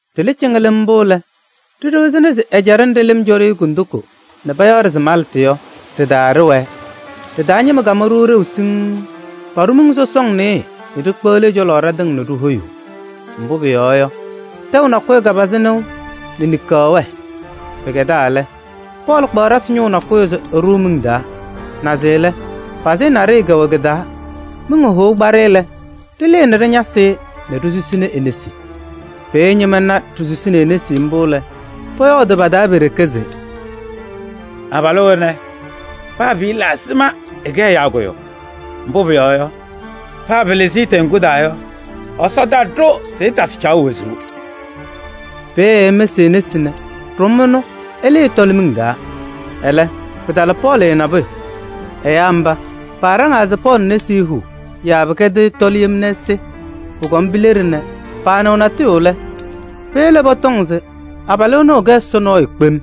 Ɖɩlɩ cɩŋɩlɩm mbʋ lɛ, ɖiɖiɣzini se ɛjaɖɛ nɖɩ lɩm cɔ-ɖɩ kondiko nɛ payaɣ-ɖɩ se Maltɩ yɔ, ɖɩ-taa ɖɩwɛɛ. Ɖɩ-taa ñɩma kamʋ-ɖʋ ɖeu siŋŋ: paɖʋ miŋ sɔsɔŋ nɩɩyɩ nɛ ɖikpeɣli ɛ-cɔlɔ ɖatɩŋa nɛ ɖihoyuu. Mbʋ pʋyɔɔ yɔ, tɛʋ nakʋyʋ kapazɩ nɩʋ nɛ niŋkaɣ wɛɛ. Pɩkɛdaa lɛ, Pɔɔlɩ kpaɣ ɖasɩ ñʋʋ nakʋyʋ se ɛɖʋʋ miŋ taa, naze lɛ, pazɩyɛ naɖɩyɛ kɛwɛ kɩ-taa. Miŋ hohou kpa-ɖɩ lɛ, ɖɩlɩɩ nɛ ɖɩñasɩ-ɩ nɛ ɖisusini e-nesi. Peeye ñɩma na ɖisusini e-nesi mbʋ lɛ, pɔyɔɔdʋʋ pa-taa pe-ɖeke se: “Abalʋ ɛnɛ, paa pɩɩla ɛzɩma ɛkɛ ɛyaa kʋyʋ, mbʋ pʋyɔɔ yɔ, paa pɩlɩzɩ-ɩ teŋgu taa yɔ, Ɛsɔ taɖʋ se ɛtasɩ caɣʋ wezuu.” Peeye ɛmɩsɩ e-nesi nɛ ɖʋm ɛnʋ ɛlɩɩ ɛtɔlɩ miŋ taa. Ɛlɛ, pɩtala Pɔɔlɩ nabʋyʋ. Ɛyaa mba, paaɖaŋaa se Pɔɔlɩ nesi huu yaa pɩkɛdɩɣ ɛtɔlɩ yem nɛ ɛsɩ. Pʋkɔm pileɖi nɛ paanɩɣ natʋyʋ lɛ, peyele pɔtɔŋ se abalʋ ɛnʋ ɛkɛ ɛsɔ nɔɔyʋ kpem.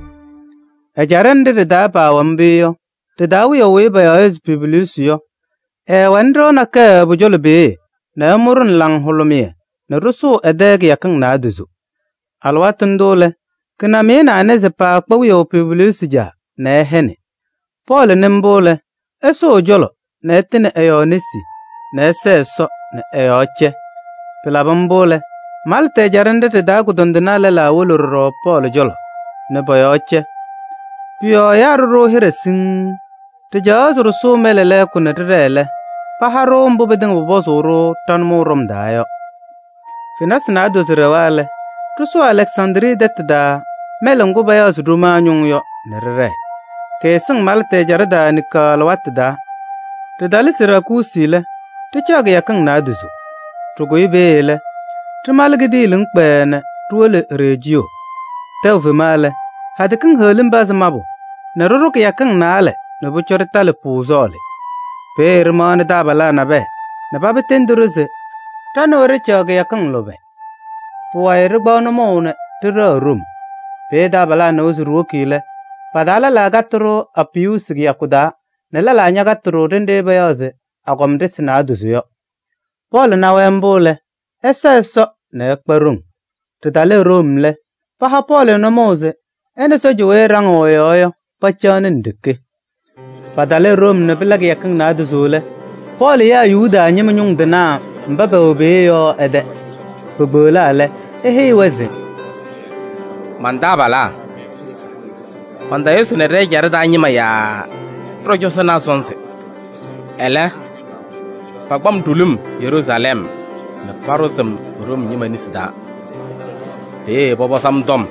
Ɛjaɖɛ nɖɩ ɖɩ-taa paawɛ mbʋ yɔ, ɖɩ-taa wiyaʋ weyi payaɣ se Publiyuusi yɔ, ɛɛwɛnɩ ɖɩɣa nakɛyɛ pʋ-cɔlɔ peeye nɛ ɛmʋ-ɖʋ nɛ laŋhʋlʋmɩyɛ nɛ ɖɩsʋʋ ɛ-tɛ kɩyakɩŋ naadozo. Alɩwaatʋ ndʋ lɛ, kɩnamɩyɛ nɛ anɩza paakpa wiyaʋ Publiyuusi caa nɛ ɛhɛnɩ. Pɔɔlɩ nɩ mbʋ lɛ, ɛsʋʋ ɛ-cɔlɔ nɛ ɛtɩnɩ ɛ-yɔɔ nesi nɛ ɛsɛɛ Ɛsɔ nɛ ɛ-yɔɔ cɛ. Pɩlabɩ mbʋ lɛ, Maltɩ ɛjaɖɛ nɖɩ ɖɩ-taa kʋdɔndɩnaa lɛlaa wolo ɖɔɖɔ Pɔɔlɩ cɔlɔ nɛ pɔ-yɔɔ cɛ. Pʋ-yɔɔ ɛyaa ɖʋ-ɖʋ hɩɖɛ siŋŋ, ɖɩcaɣaɣ se ɖɩsʋʋ mɛlɛ lɛɛkʋ nɛ ɖɩɖɛɛ lɛ, paha-ɖʋ mbʋ pɩtɩŋa pʋpɔzʋʋ-ɖʋ ɖa-nʋmɔʋ ɖɔm taa yɔ. Fenasɩ naadozo ɖɛwa lɛ, ɖɩsʋʋ Alɛksandrii tɛtʋ taa mɛlɛ ŋgʋ payaɣ se Ɖomaa Ñʋŋ yɔ nɛ ɖɩɖɛɛ. Kɩɩsɩŋ Maltɩ ɛjaɖɛ taa niŋkaɣ alɩwaatʋ taa. Ɖɩtalɩ Siraakuusi lɛ, ɖɩcaɣ kɩyakɩŋ naadozo. Ɖɩkʋyɩ peeye lɛ, ɖɩmalɩ kidiiliŋ kpɛɛɛ nɛ ɖiwolo Rejiyoo. Tɛʋ fema lɛ, hadɛ kiŋ heɣlim pazɩ mabʋ nɛ ɖɩɖʋ kɩyakɩŋ naalɛ nɛ pʋcɔ ɖɩtalɩ Puuzɔɔlɩ. Peeye ɖɩmaɣnɩ taabalaa nabɛyɛ nɛ paba tendi-ɖʋ se ɖa nɛ wɛ ɖɩcaɣ kɩyakɩŋ lʋbɛ. Pʋwayɩ ɖɩkpaɣ nʋmɔʋ nɛ ɖɩɖɛɣ Room. Peeye taabalaa nɩwa se ɖiwoki lɛ, pa-taa lɛlaa katɩ-ɖʋ Apiyuusi kɩyakʋ taa nɛ lɛlaa ñakatɩ-ɖʋ ɖenɖe payaɣ se Agɔma Ɖɩsɩ Naadozo yɔ. Pɔɔlɩ na-wɛ mbʋ lɛ, ɛsa Ɛsɔ nɛ ɛkpa ɖoŋ. Ɖɩtalɩ Room lɛ, paha Pɔɔlɩ nʋmɔʋ se ɛ nɛ sɔɔja weyi ɛɖaŋɩɣ ɛ-yɔɔ yɔ, pacaɣnɩ nɖeke. Patalɩ Room nɛ pɩla kɩyakɩŋ naadozo lɛ, Pɔɔlɩ yaa Yuda ñɩma ñʋŋ tɩnaa mba pɛwɛ peeye yɔ ɛ-tɛ. Pekpeɣlaa lɛ, eheyi-wɛ se: “Man-taabalaa! Mantayʋsɩnɩ ɖɛ-ɛjaɖɛ taa ñɩma yaa ɖɔ-cɔzɔnaa sɔnzɩ. Ɛlɛ, pakpa-m ɖulum Yeruusalɛm nɛ paɖʋzɩ-m Room ñɩma nesi taa. Peeye pɔpɔzɩ-m tɔm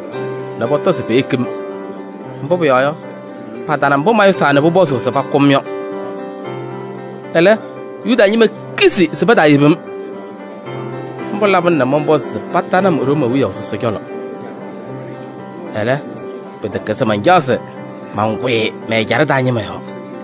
nɛ pɔtɔ se peyeki-m, mbʋ pʋyɔɔ yɔ, patana mbʋ mayʋsaa nɛ pʋpɔzʋʋ se pakʋ-m yɔ. Ɛlɛ, Yuda ñɩma kizi se pataayebi-m. Mbʋ labɩna nɛ mɔnpɔzɩ se patanɩ-m Room wiyaʋ sɔsɔ cɔlɔ. Ɛlɛ pɩtɛkɛ se mancaɣ mankʋyɩ mɛ-ɛjaɖɛ taa ñɩma yɔɔ.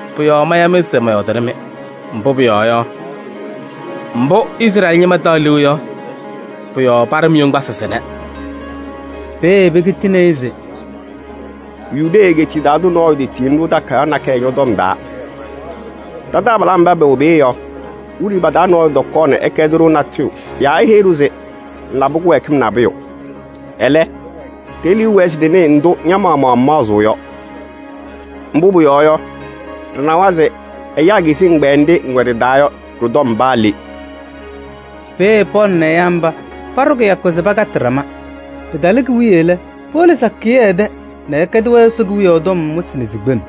Pʋ-yɔɔ maya-mɩ se mɔyɔɔdɩnɩ-mɩ, mbʋ pʋyɔɔ yɔ, mbʋ Izrɛɛlɩ ñɩma taɣ liu yɔ, pʋ-yɔɔ paɖɩ-m yoŋgbasɩ sɩnɛ.” Peeye pekitini-i se: “Yudee egeetiye taa tʋ nɔɔyʋ tetiyini-ɖʋ takayaɣ nakɛyɛ ñɔ-tɔm taa. Ɖa-taabalaa mba pɛwɛ peeye yɔ, wiɖiyi pa-taa nɔɔyʋ tɔkɔɔ ɛkɛdɩ-ɖʋ natʋyʋ yaa eheyi-ɖʋ se ŋlabɩ kɩwɛɛkɩm nabʋyʋ. Ɛlɛ, ɖe-liu wɛɛ se ɖɩnɩɩ ndʋ ña-maɣmaɣ ŋmaɣzɩɣ yɔ. Mbʋ pʋyɔɔ yɔ, ɖɩnawa se ɛyaa kizi ɛgbɛyɛ nɖɩ ŋwɛ ɖɩ-taa yɔ ɖɩ-tɔm paa le.” Peeye Pɔɔlɩ nɛ ɛyaa mba paɖʋ kɩyakʋ se pakatɩ ɖama. Pɩtalɩ ki-wiye lɛ, powolo sakɩyɛ ɛ-tɛ nɛ ɛkɛdɩ-wɛ Ɛsɔ Kewiyaɣ tɔm wɩsɩ nɛ sikpem: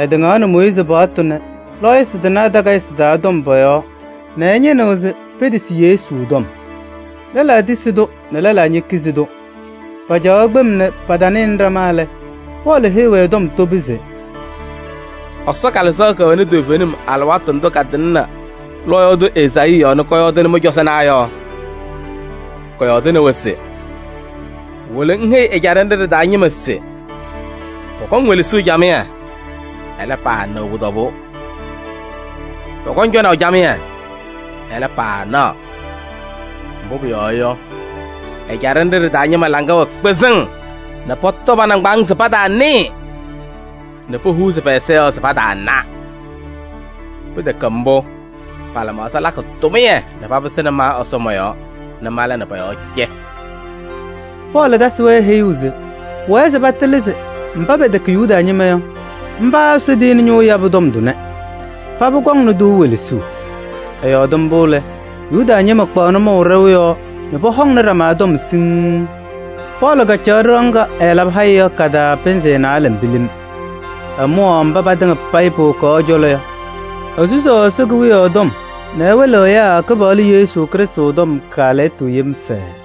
ɛtɩŋaɣnɩ Mooyiizi paɣtʋ nɛ lɔɔyɩsɩ tɩnaa takayɩsɩ taa tɔm pɔ-yɔɔ nɛ ɛñɩnɩɣ se petisi Yesu tɔm. Lɛlaa tisi-tʋ nɛ lɛlaa ñekizi-tʋ. Pacaɣaɣ kpem nɛ patanɩnɩ ɖama lɛ, Pɔɔlɩ heyi-wɛ tɔm tobi se: “Ɛsɔ Kalɩzaɣ kɛwɛnɩ toovenim alɩwaatʋ ndʋ katɩŋnɩ lɔɔyaɣ tʋ Ezaayii yɔɔ nɛ kɔyɔɔdɩnɩ mɩ-cɔzɔnaa yɔ! Kɔyɔɔdɩnɩ-wɛ se: ‘Wolo ŋheyi ɛjaɖɛ nɖɩ ɖɩ-taa ñɩma se pɔkɔŋ welesuu camɩyɛ, ɛlɛ, paanɩɣ pʋ-tɔbʋʋ. Pɔkɔŋ cɔnaʋ camɩyɛ, ɛlɛ, paanaɣ. Mbʋ pʋyɔɔ yɔ, ɛjaɖɛ nɖɩ ɖɩ-taa ñɩma laŋa wɛ kpɩzɩŋ nɛ pɔtɔ pa-nɩŋgbaaŋ se pataanɩɩ, nɛ pohuuzi pɛ-ɛza yɔɔ se pataana. Pɩtɛkɛ mbʋ, pa-lɩmaɣza lakɩ tʋmɩyɛ nɛ papɩsɩnɩ ma Ɛsɔ mɔ-yɔɔ nɛ mala nɛ pɔ-yɔɔ cɛ.’” Pɔɔlɩ tasɩ-wɛ heyuu se pʋwɛɛ se patɩlɩ se mba pɛtɛkɛ Yuda ñɩma yɔ, mba Ɛsɔ tiyini ñʋʋ yabʋ tɔm tʋnɛ. Paba kɔŋnɩ-tʋ welesuu! [ Ɛyɔɔdɩ mbʋ lɛ, Yuda ñɩma kpaɣ nʋmɔʋ ɖɛʋ yɔɔ nɛ pɔhɔŋnɩ ɖama tɔm siŋŋ.] Pɔɔlɩ kacaɣ ɖɩɣa ŋga ɛɛlabɩ haya yɔ ka-taa pɩnzɩ naalɛ pilim. Ɛmʋwaɣ mba patɩŋa payɩ powokaɣ ɛ-cɔlɔ yɔ. Esusaɣ Ɛsɔ Kewiyaɣ tɔm nɛ ɛwɩlɩɣ ɛyaa Kɩpaɣlʋ Yesu Krɩstʋ tɔm kaalɛyɩtʋ yem fɛɛɛ.